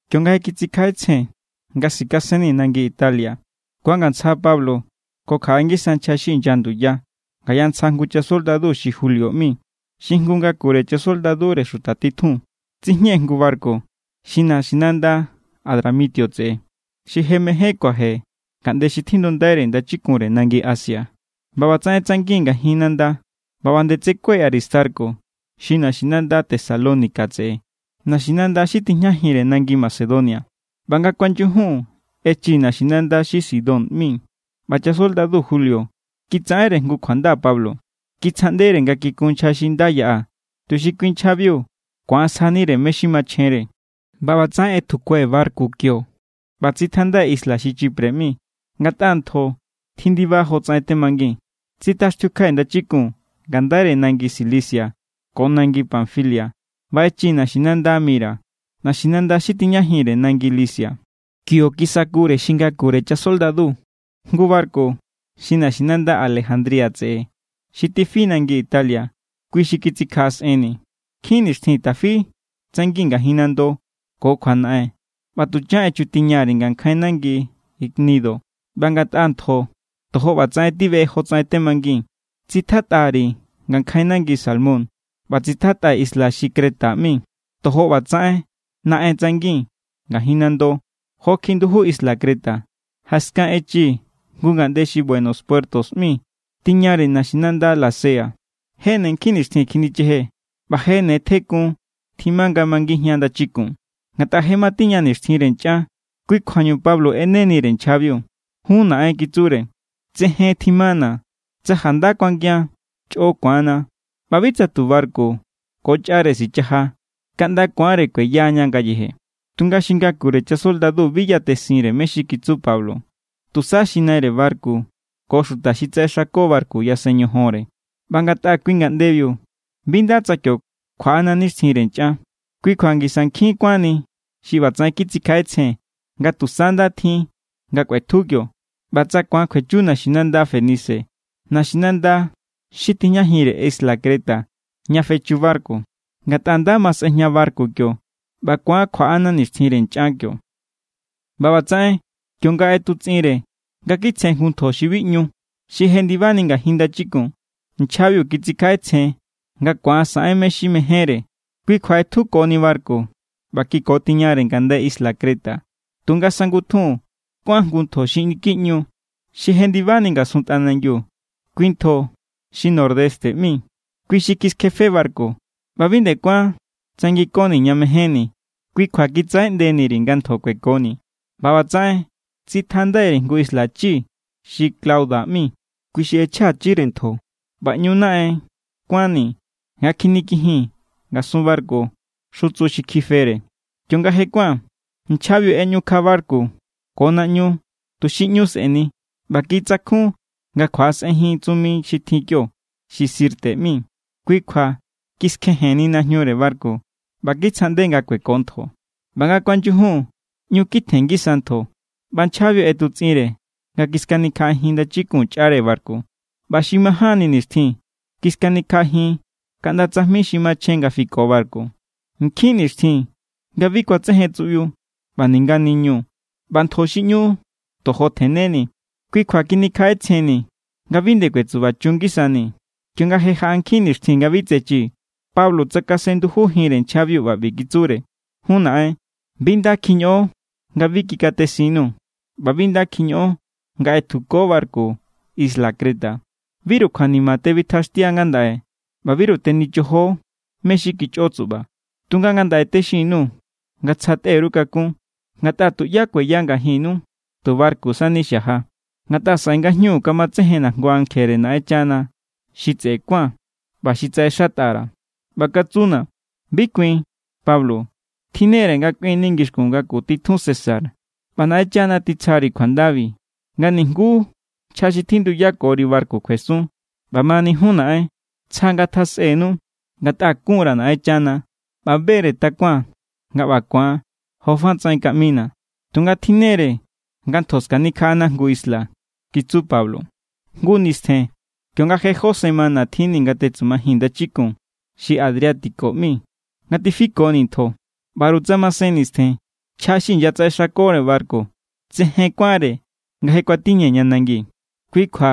Kionga je kitsikjaꞌetsjen nga sikasennii̱ nangi Italia, kuangantsja Pablo ko kjaꞌe ngisa nchja xi inya nduya ngaya ntsja jngu chasoldadu xi Julio ꞌmi xi jngu ngakure chasoldadure xuta titjun. Tsijñee̱ jngu barku xi naxinanda Adramitio tseꞌe, xi je mején kuaje ngaꞌnde xi tjindundaire ndachikunre nangi Asia. ꞌBa ꞌbatsaꞌen tsangii̱n ngajin nanda ꞌba ꞌba nde tsekue̱ Aristarco xi naxinanda Tesalónica tseꞌe, naxinanda xi tijñajinre nangi Macedonia. ꞌBa nga kuanyujun echii̱ naxinanda xi Sidón ꞌmi, ꞌba chasoldadu Julio kitsaꞌenre jngu kjuanda Pablo. Kitsjaꞌndere nga kikun nchja xi nda yaꞌa tuxi kui nchjabiu ku̱an sjanire mé= xi machjenre. ꞌBa ꞌbatsaꞌen ꞌetjukue̱ barku kio ꞌba tsitjandai̱ isla xi Chipre ꞌmi, ngatꞌa ntjo tjindiba jotsaꞌen temangii̱n. Tsitjaxtiukjai̱ ndachikun ngandaire nangi Cilicia ko nangi Panfilia ꞌba echii̱ naxinanda Mira, naxinanda xi tijñajinre nangi Licia. Kio kisakure xi ngakure chasoldadu jngu barku xi naxinanda Alejandría tseꞌe xi tifi nangi Italia. Kui xi kitsikjaꞌasꞌenni̱. Nkjin nixtjin tafi tsangii̱n ngajin nando ko kjuanaꞌen ꞌba tuchan echutiña_ri̱ ngankjain nangi Gnido. ꞌBa ngatꞌa ntjo tojo ꞌbatsaꞌen tibeꞌe jotsaꞌen temangii̱n, tsitjatꞌa_ri̱ ngankjain nangi Salmón ꞌba tsitjatꞌai̱ isla xi Creta ꞌmi. Tojo ꞌbatsaꞌen naꞌen tsangii̱n ngajin nando jokjiꞌi nduju isla Creta. Jaskan echii̱ jngu ngaꞌnde xi Buenos Puertos ꞌmi tiñare naxinanda Lasea. Je ne nkjin nixtjin kjinichejee̱, ꞌba je ne tjekun tjima nga mangijian ndachikun, ngatꞌa je matiña nixtjinre nchꞌan. Kui= kjuañu Pablo ꞌenenire nchjabiu. —Jun naꞌen —kitsure—, tsejen tjimana̱. Tsa janda kuangian, chꞌo ku̱anna ꞌba bi tsa tu barku ko chꞌare sichaja, kaꞌnda ku̱anre kueya ña ngayeje. Tunga xi ngakure chasoldadu bi yatesinre mé= xi kitsu Pablo. Tusa xi naire barku ko xuta xi tsaꞌexako barku yasen ñojonre. ꞌBa ngatꞌa kui ngaꞌndebiu bi nda tsa kio kjuaꞌana nixtjinre nchꞌan, kui kjua ngisa nkjin kuánni xi ꞌbatsaꞌen kitsikjaꞌetsjen nga tusa nda tjin nga kꞌuetju kio, ꞌba tsa ku̱an kjuechu naxinanda Fenice, naxinanda xi tijñajinre isla Creta ña fechu barku. Ngatꞌa nda ma sꞌejña barku kio, ꞌba ku̱an kjuaꞌana nixtjinre nchꞌan kio. ꞌBa ꞌbatsaꞌen kionga ꞌetutsꞌinre nga kitsjen jngu ntjo xi bi ꞌñu, xi jendibani ngajin ndachikun, nchjabiu kitsikjaꞌetsjen nga ku̱an saꞌen mé= xi mejénre. Kui kjua ꞌetjukoni barku ꞌba kikotiñare ngaꞌndai isla Creta. Tunga sangutjun kuán jngu ntjo xi niki ꞌñu, xi jendibani ngasun tꞌanangiu. Kui ntjo xi Nordeste ꞌmi. Kui xi kiskjefe barku, ꞌba bi nde kuán tsanginkoni̱ ña mejénni̱. Kui kjua kitsaꞌeꞌndeni_ri̱ nga ntjo kuekoni̱. ꞌBa ꞌbatsaꞌen tsitjandai_ri̱ jngu isla chi xi Clauda ꞌmi, kui xi ꞌechjachire ntjo. ꞌBa ꞌñu naꞌen kuánni̱ nga kjinikijii̱n ngasun barku xutsu xi kjifere. Kionga je kuán, nchjabiu ꞌeꞌñukja barku ko naꞌñu tuxi ꞌñu sꞌe̱ni. ꞌBa kitsakjun nga kjuaꞌasꞌenjin tsumi xi tjin kio xi Sirte ꞌmi. Kui kjua kiskjejenni najñure barku ꞌba kitsjaꞌnde nga kueko ntjo. ꞌBa nga kuanyujun ꞌñu kitjen ngisa ntjo, ꞌba nchjabiu ꞌetutsꞌinre nga kiskanikjaꞌajin ndachikun chꞌare barku. ꞌBa xi majánni nixtjin, kiskanikjaꞌajin kaꞌnda tsajmi xi machjen nga fiko barku. Nkjin nixtjin nga bi kuatsejen tsuꞌbiu ꞌba ninga niñu ꞌba ntjo xi ꞌñu tojo tjenneni̱. Kui kjua kjinikjaꞌetsjennii̱ nga bi nde kuetsubachun ngisanii̱. Kionga je jaꞌa nkjin nixtjin nga bi tsechii̱, Pablo tsakasen ndujujinre nchjabiu ꞌba ꞌbi kitsure: —Jun naꞌen, bi nda kjiñoꞌon nga bi kikatesinnu, ꞌba bi nda kjiñoꞌon nga ꞌetjuko barku isla Creta. Biru kjuanima tebitjaxtiu ngandaꞌe ꞌba biru tenichojo mé= xi kichꞌo tsuꞌba. Tunga ngandaꞌe texin_nuu̱ nga tsja tꞌe_ru kakún, ngatꞌa tuꞌyá kueya ngajinnu. Tu barku sani xaja. Ngatꞌa saꞌe ngajñu kamatsejenna̱ jngu ankjere Naꞌenchana xi tseꞌe kuán ꞌba xi tsaꞌexatꞌa_ra̱. ꞌBa katsuna̱: “Bi kuin, Pablo. Tjinnere nga kꞌuinni ngixkun ngaku titjun César, ꞌba Naꞌenchana titsjari kjuandabi nga nijnguú nchja xi tjinduyakori barku kjuesun.” ꞌBamani jun naꞌen, tsja ngatjasꞌennu. Ngatꞌa kun_ra̱ Naꞌenchana ꞌba be=re takuaa̱n nga ꞌba ku̱an jofa tsaꞌen nga kaꞌmina̱. Tunga tjinnere nga ntjo skanikjaꞌana jngu isla —kitsu Pablo. Jngu nistjen kionga je jó semana tjinni̱ nga tetsumajii̱n ndachikun xi Adriático ꞌmi nga tifikonii̱ ntjo, ꞌbaru tsa masen nistjen, nchja xi inyatsaꞌexakore barku tsejen kuánre nga je kuatiñee̱ ña nangi. Kui kjua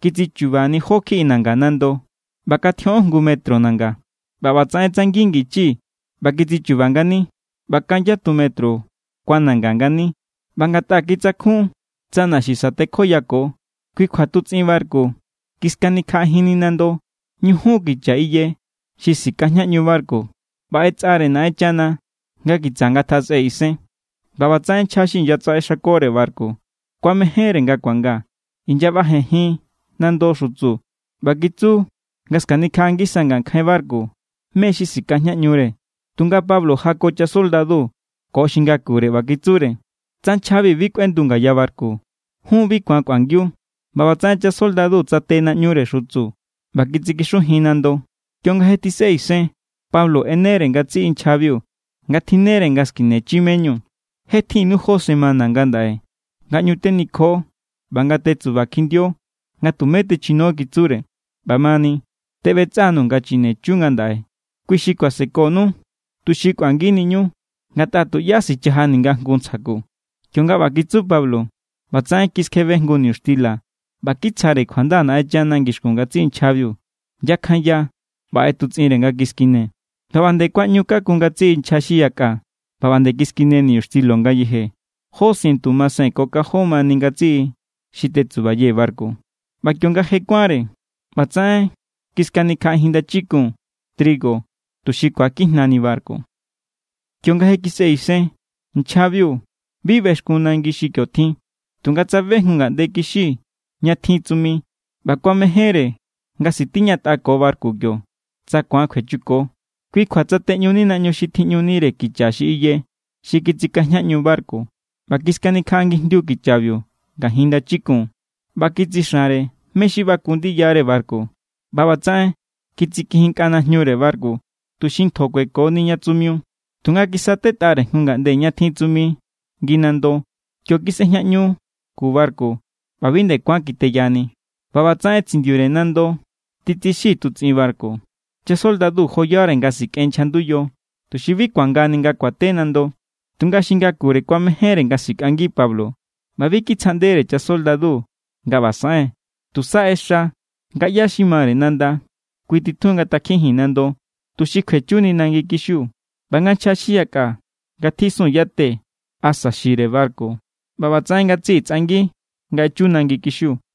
kitsichu̱ba̱ jó kjiꞌi nanga nando, ꞌba kan tjioꞌon jngu metro nanga. ꞌBa ꞌbatsaꞌen tsangin ngichii̱ ꞌba kitsichu̱ba̱ ngani, ꞌba kan yatu metro kuananga ngani. ꞌBa ngatꞌa kitsakjun tsa naxi sa̱tekjoyako, kui kjua tutsꞌin barku kiskanikjaꞌajinni nando ñujun kicha iye xi sikajñaꞌñu barku ꞌba ꞌetsꞌare Naꞌenchana nga kitsa ngatjasꞌe isen. ꞌBa ꞌbatsaꞌen nchja xi inyatsaꞌexakore barku kuamejénre nga kuanga. Inyaꞌbajenjin nando xutsu ꞌba kitsu nga skanikjaꞌa ngisa ngankjain barku mé= xi sikajñaꞌñure. Tunga Pablo jako chasoldadu ko xi ngakure ꞌba kitsure: —Tsa nchjabi bi kꞌuendu ngaya barku, jun bi ku̱an kꞌuangiu. ꞌBa ꞌbatsaꞌen chasoldadu tsate naꞌñure xutsu ꞌba kitsikixujin nando. Kionga je tjisꞌe isen, Pablo ꞌenere ngatsiꞌi nchjabiu nga tjinnere nga skinechi me=ñu. —Je tjinnu jó semana ngandaꞌe nga ꞌñu tenikjo ꞌba nga tetsuba kjindio nga tumé techino —kitsure—. ꞌBamani, teꞌbetsꞌa_nuu̱ nga chinechu ngandaꞌe. Kui xi kuasekonu tuxi kꞌuanginiñu. Ngatꞌa tuꞌyá sichaja ninga jngu ntsja ku. Kionga ꞌba kitsu Pablo, ꞌbatsaꞌen kiskjebe jngu niñuxtila ꞌba kitsjare kjuanda Naꞌenchana ngixkun ngatsiꞌi nchjabiu. Yakjanya ꞌba ꞌetutsꞌinre nga kiskine. ꞌBa ꞌba nde kuaꞌñukakun ngatsiꞌi nchja xi yakꞌa ꞌba ꞌba nde kiskine niñuxtilo ngayeje. Jó sientu masen ko kanjon mani ngatsiꞌi xi tetsubayee̱ barku. ꞌBa kionga je kuánre, ꞌbatsaꞌen kiskanikjaꞌajin ndachikun trigo, tuxi ku̱akijñani barku. Kionga je kisꞌe isen, nchjabiu bi bexkun nangi xi kio tjin. Tunga tsabe jngu ngaꞌnde kixi ña tjin tsumi ꞌba kuamejénre nga sitiñatꞌako barku kio, tsa ku̱an kjuechuko. Kui kjua tsateꞌñuni naꞌñu xi tjiꞌñunire kicha iye xi tsikajñaꞌñu barku ꞌba kiskanikjaꞌangijndiu kichabiu ngajin ndachikun ꞌba kitsixanre mé= xi baku ndiyare barku. ꞌBa ꞌbatsaꞌen kitsikijinnkꞌa najñure barku, tuxi ntjo kuekoni ña tsumiu. Tunga kisatetꞌare jngu ngaꞌnde ña tjin tsumi ngi nando. Kio kisꞌejinꞌñu ku barku ꞌba bi nde kuán kiteyani. ꞌBa ꞌbatsaꞌen tsindiure nando titsixi tutsꞌin barku. Chasoldadu joyare nga sikꞌen nchja nduyo, tuxi bi ku̱angani nga kuate nando. Tunga xi ngakure kuamejénre nga sikꞌangi Pablo ꞌba bi kitsjaꞌndere chasoldadu nga ꞌba saꞌen. Tusa ꞌexa nga ꞌyá xi mare nanda, kui titjun nga ngatakjijin nando, tuxi kjuechuni nangi kixiu, ꞌba nga nchja xi yakꞌa ngatjisun yate asa xire barku. ꞌBa ꞌbatsaꞌen ngatsiꞌi tsꞌangi nga echu nangi kixiu.